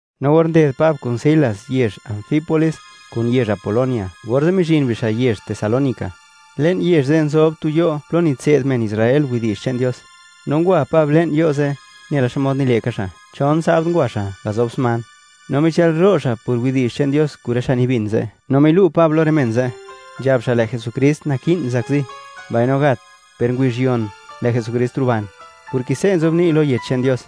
No or nded Pab kun Silas yezh Anfípolis kun yezh Apolonia, orze' mizhin bixa' yezh Tesalónica. Le'n yezh ze' nzob tu yo' plo nitse'd men Israel widi'zh che'n Dios. No ngwa Pab le'n yo' ze' nela xmod nile' ka xa', chon sabd ngwa xa' gazob sman, no michëlro' xa' por widi'zh che'n Dios kun rë xa' nibin ze'. No milu' Pab lo rë men ze', nzhab xa' lë' Jesukrist naki'n zakzi, mbaino gat, per ngubizh yon, lë' Jesukrist ruban, porke se' nzobni' lo Yech che'n Dios.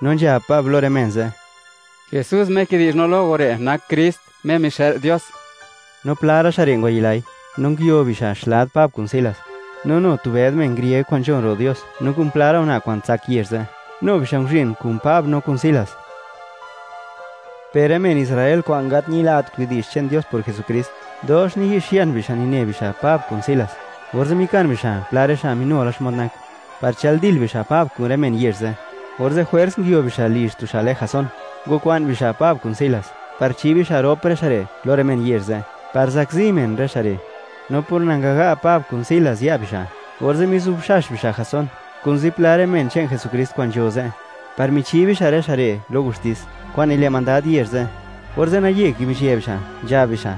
No nzhab Pab lo rë men ze': ―Jesús Me kidizha lo go re', nak Krist Me mixë'l Dios. No pla ra' xa' re' ngwayilai, no nguio bixa' xlad Pab kun Silas. No nu tu bëd men grieg kwa'n nzhon ro' Dios, no kun pla ra' una' kwa'n tsak yezh ze', nu bixa' nguzhin kun Pab no kun Silas. Per rë men Israel kwa'n gat ñilat widi'zh che'n Dios por Jesukrist, dox niyi'xian bixa', nine bixa' Pab kun Silas, orze' mikan bixa' pla rë xa' minu la xmod nak, par chëldil bixa' Pab kun rë men yezh ze'. Orze' jwers nguio bixa' lizh tu xa' lë Jasón, ngwakwa'n bixa' Pab kun Silas, par chi bixa' rop rë xa' re' lo rë men yezh ze' par zakzi men rë xa' re'. No por nangaga' Pab kun Silas ya' bixa', orze' mizubxax bixa' Jasón kun zipla rë men che'n Jesukrist kwa'n nzho ze', par michi bixa' rë xa' re' lo gustis kwa'n nile' mandad yezh ze', orze' naye kibizhië bixa', nzhab bixa':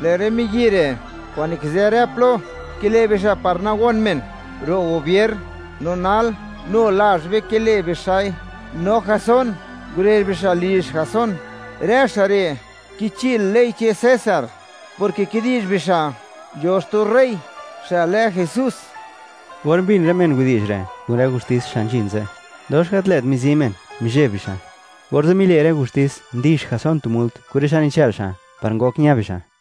―¡Lë' rë miyi' re' kwa'n nikizë rë plo, kile' bixa' par nagon men ro' gubier! ¡No nal, nu lazh be kile' bixa'i! No Jasón ngurezh bixa' lizh Jasón. ¡Rë xa' re' kichil ley che'n César, porke kidi'zh bixa' nzho xtu rey xa' lë Jesús! Or mbin rë men widi'zh re' kun rë gustis xa' nzhin ze', dox gat lë't mizi men, mizheb bixa'. Orze' mile' rë gustis ndix Jasón tu mult, kun rë xa' nichë'l xa', par ngok ña bixa'.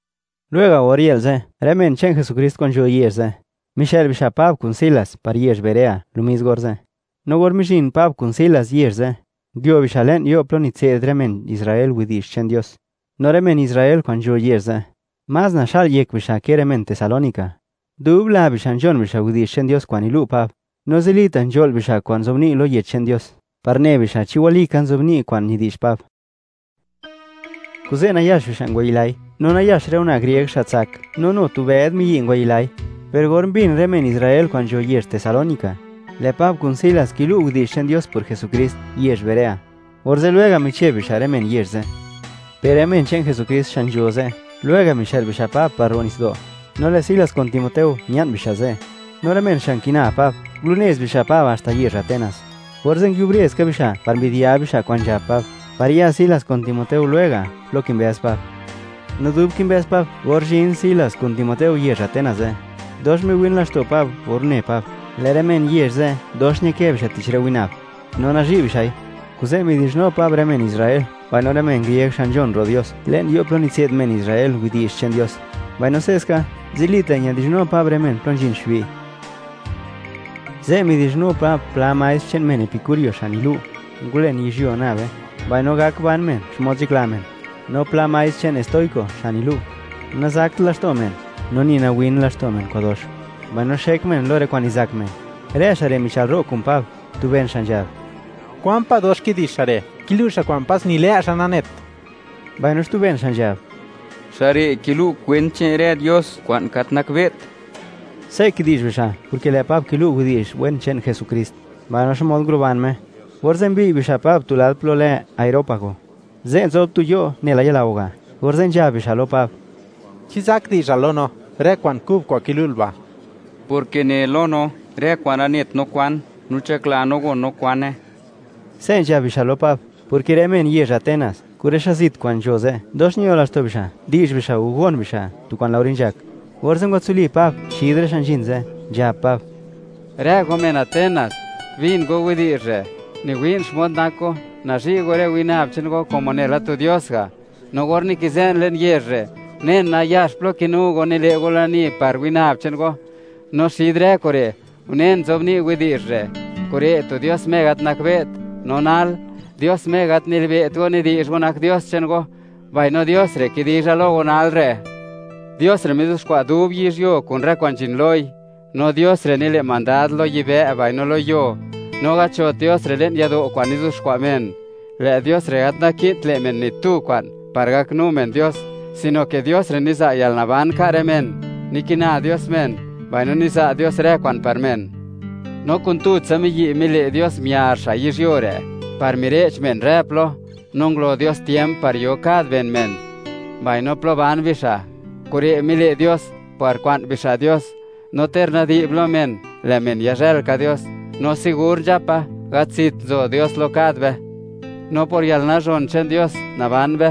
Lwega', or yë'l ze', rë men che'n Jesukrist kwa'n nzho yezh ze', mixë'l bixa' Pab kun Silas, par yezh Berea lo mis orze'. No or mizhin Pab kun Silas yezh ze', nguio bixa' le'n yo' plo nitse'd rë men Israel widi'zh che'n Dios. No rë men Israel kwa'n nzho yezh ze', más naxa'l yek bixa', ke rë men Tesalónica. Dub la bixa' nzhon bixa' widi'zh che'n Dios kwa'n nilu' Pab, no zilita' nzho'l bixa' kwa'n nzobni' lo Yech che'n Dios, par ne bixa' chi walika nzobni' kwa'n nidi'zh Pab. Kuze', nayax bixa' ngwayilai, no nayax rë una' grieg xa' tsak, no nu tu bëd miyi' ngwayilai. Per or mbin rë men Israel kwa'n nzho yezh Tesalónica, lë' Pab kun Silas kilu' widi'zh che'n Dios por Jesukrist yezh Berea, orze' lwega' micheb bixa' rë men yezh ze'. Per rë men che'n Jesukrist xa' nzho ze', lwega' mixë'l bixa' Pab, par ro' nitsdo', no lë' Silas kun Timoteo, mia'n bixa' ze'. No rë men xa' nkina Pab, ngulunez bixa' Pab haxta yezh Atenas. Orze' nguiubre ska bixa' par mbi'dyab bixa' kwa'n nzhab Pab, par ya Silas kun Timoteo lwega' plo kimbëz Pab. No dub kimbëz Pab or zhin Silas kun Timoteo yezh Atenas ze', dox miwin laxto' Pab or une Pab, lë' rë men yezh ze', dox ñakë bixa' tich rë winab, no nazhi' bixa'i. Kuze' midi'zhnu Pab rë men Israel mbaino rë men grieg xa' nzhon ro' Dios plo nitse'd bixa' widi'zh che'n Dios; mbaino se'ska, zilita' midi'zhnu Pab rë men plo nzhin xbi'. Ze' midi'zhnu Pab pla maestr che'n men epikúrio xa' nilu', ngulen yizhyuo nabe, mbaino gak ban men xmod nzhakla men, no pla maestr che'n estóiko xa' nilu', nazakt laxto' men no ni nawin laxto' men kwa'dox, mbaino xek men lo rë kwa'n nizak men. Rë xa' re' michëlro' kun Pab. Tu ben xa' nzhab: ―¿Kwan pa' dox kidi'zh xa' re'? Kilu' xa' kwa'n pas ni lë' xa' nanet. Mbaino xtu ben xa' nzhab: ―Xa' re' kilu' kwent che'n rë dios kwa'n gat nakbe't. Se' kidi'zh bixa', porke lë' Pab kilu' widi'zh wen che'n Jesukrist, mbaino xmod nguruban Me. Orze' mbiy' bixa' Pab tu lad plo lë Areópago. Ze' nzob tu yo' nela yalao ga', orze' nzhab bixa' lo Pab: ―¿Chi zak di'zhal lo no, rë kwa'n kub kwa'n kilu'l ba'?, porke nel lo no, rë kwa'n nanet no kwan, no nzhakla no gon no kwane. Se' nzhab bixa' lo Pab, porke rë men yezh Atenas kun rë xa' zit kwa'n nzho ze', dox ño laxto' bixa', di'zh bixa' o gon bixa' tu kwa'n laore nzhak. Orze' ngwatsuli Pab xid rë xa' nzhin ze', nzhab Pab: ―Rë go men Atenas, bin go widi'zh re'. Niwi'n xmod nak go, nazhi' go rë winab che'n go, como nela tu dios ga'. No or nikizë'n le'n yezh re', unen nayax plo kinu go, nile' go lani par winab che'n go, no xid rë kure', unen nzobni' widi'zh re': “Kure' tu dios Me gat nakbe't.” No nal, Dios Me gat nilibe't go nidi'zh go nak dios che'n go, mbaino Dios re' kidizha lo go nal re'. ’Dios re' mizuxkwa' dub yizhyuo, kun rë kwa'n nzhin loi. No Dios re' nile' mandad lo yibë' mbaino lo yuo; no gat nzhot Dios re' le'n yado' kwa'n nizuxkwa' men. Lë' Dios re' gat naki'n le' men ni tu kwa'n, par gaknu men Dios, sino ke Dios re' niza' yalnaban ka' rë men, nikina Dios men, mbaino niza' Dios rë kwa'n par men. ’No kun tutsa miyi' mile' Dios miar xa' yizhyuo re', par mire'ch men rë plo; no ngulo Dios tiemp par yo kad ben men, mbaino plo ban bixa'. Kure' mile' Dios par kwa'n bixa' Dios, no ter nadi'b lo men, lë' men yazhël ka Dios. No nzhapa segur, gat zit nzo Dios lo kad be. No por yalnazhon che'n Dios naban be,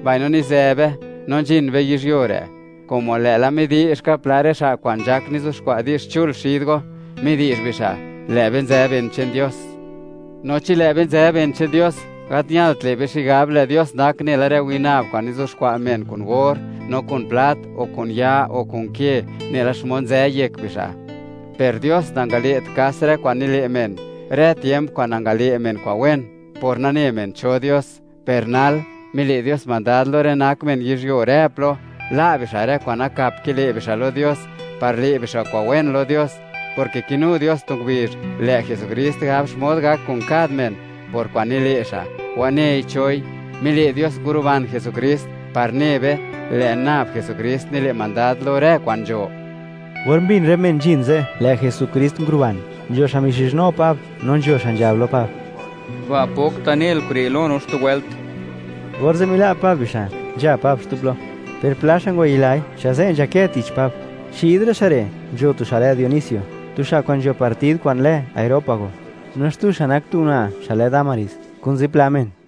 mbaino nizë be, no nzhin be yizhyuo re', como lë'la midi'zh ka pla rë xa' kwa'n nzhak nizuxkwa' di'zh chul xid go, midi'zh bixa': “Lë' be nzë ben che'n Dios.” No chi lë' be nzë ben che'n Dios, gat ñalt le' be xigab, lë' Dios nak nela rë winab kwa'n nizuxkwa' men kun or, no kun plat, o kun ya, o kun ke, nela xmod nzë yek bixa'. Per Dios nangale't kas rë kwa'n nile' men, rë tiemp kwa'n nangale' men kwa'n wen, por nagane men cho Dios. Per nal, mile' Dios mandad lo rë nak men yizhyuo rë plo, la' bixa' rë kwa'n nakap kile' bixa' lo Dios, par le' bixa' kwa'n wen lo Dios, porke kinu Dios tu ngubizh, lë' Jesukrist gab xmod gak kun kad men, por kwa'n nile' xa', wanei choi. Mile' Dios nguruban Jesukrist, par ne be, lë' nab Jesukrist nile' mandad lo rë kwa'n nzho. Or mbin rë men nzhin ze', lë' Jesukrist nguruban, nzho xa' mixizhnu Pab no nzho xa' nzhab lo Pab: ―Ba' pokta' nel kure' lo no xtu wëlt. Orze' mila' Pab bixa', nzha Pab xtu plo. Per pla xa' ngwayilai, xa' ze' nzhakë tich Pab. Xid rë xa' re' nzho tu xa' lë Dionisio, tu xa' kwa'n nzho partid kwa'n lë Areópago. No xtu xa' nak tu una' xa' lë Dámaris, kun zipla men.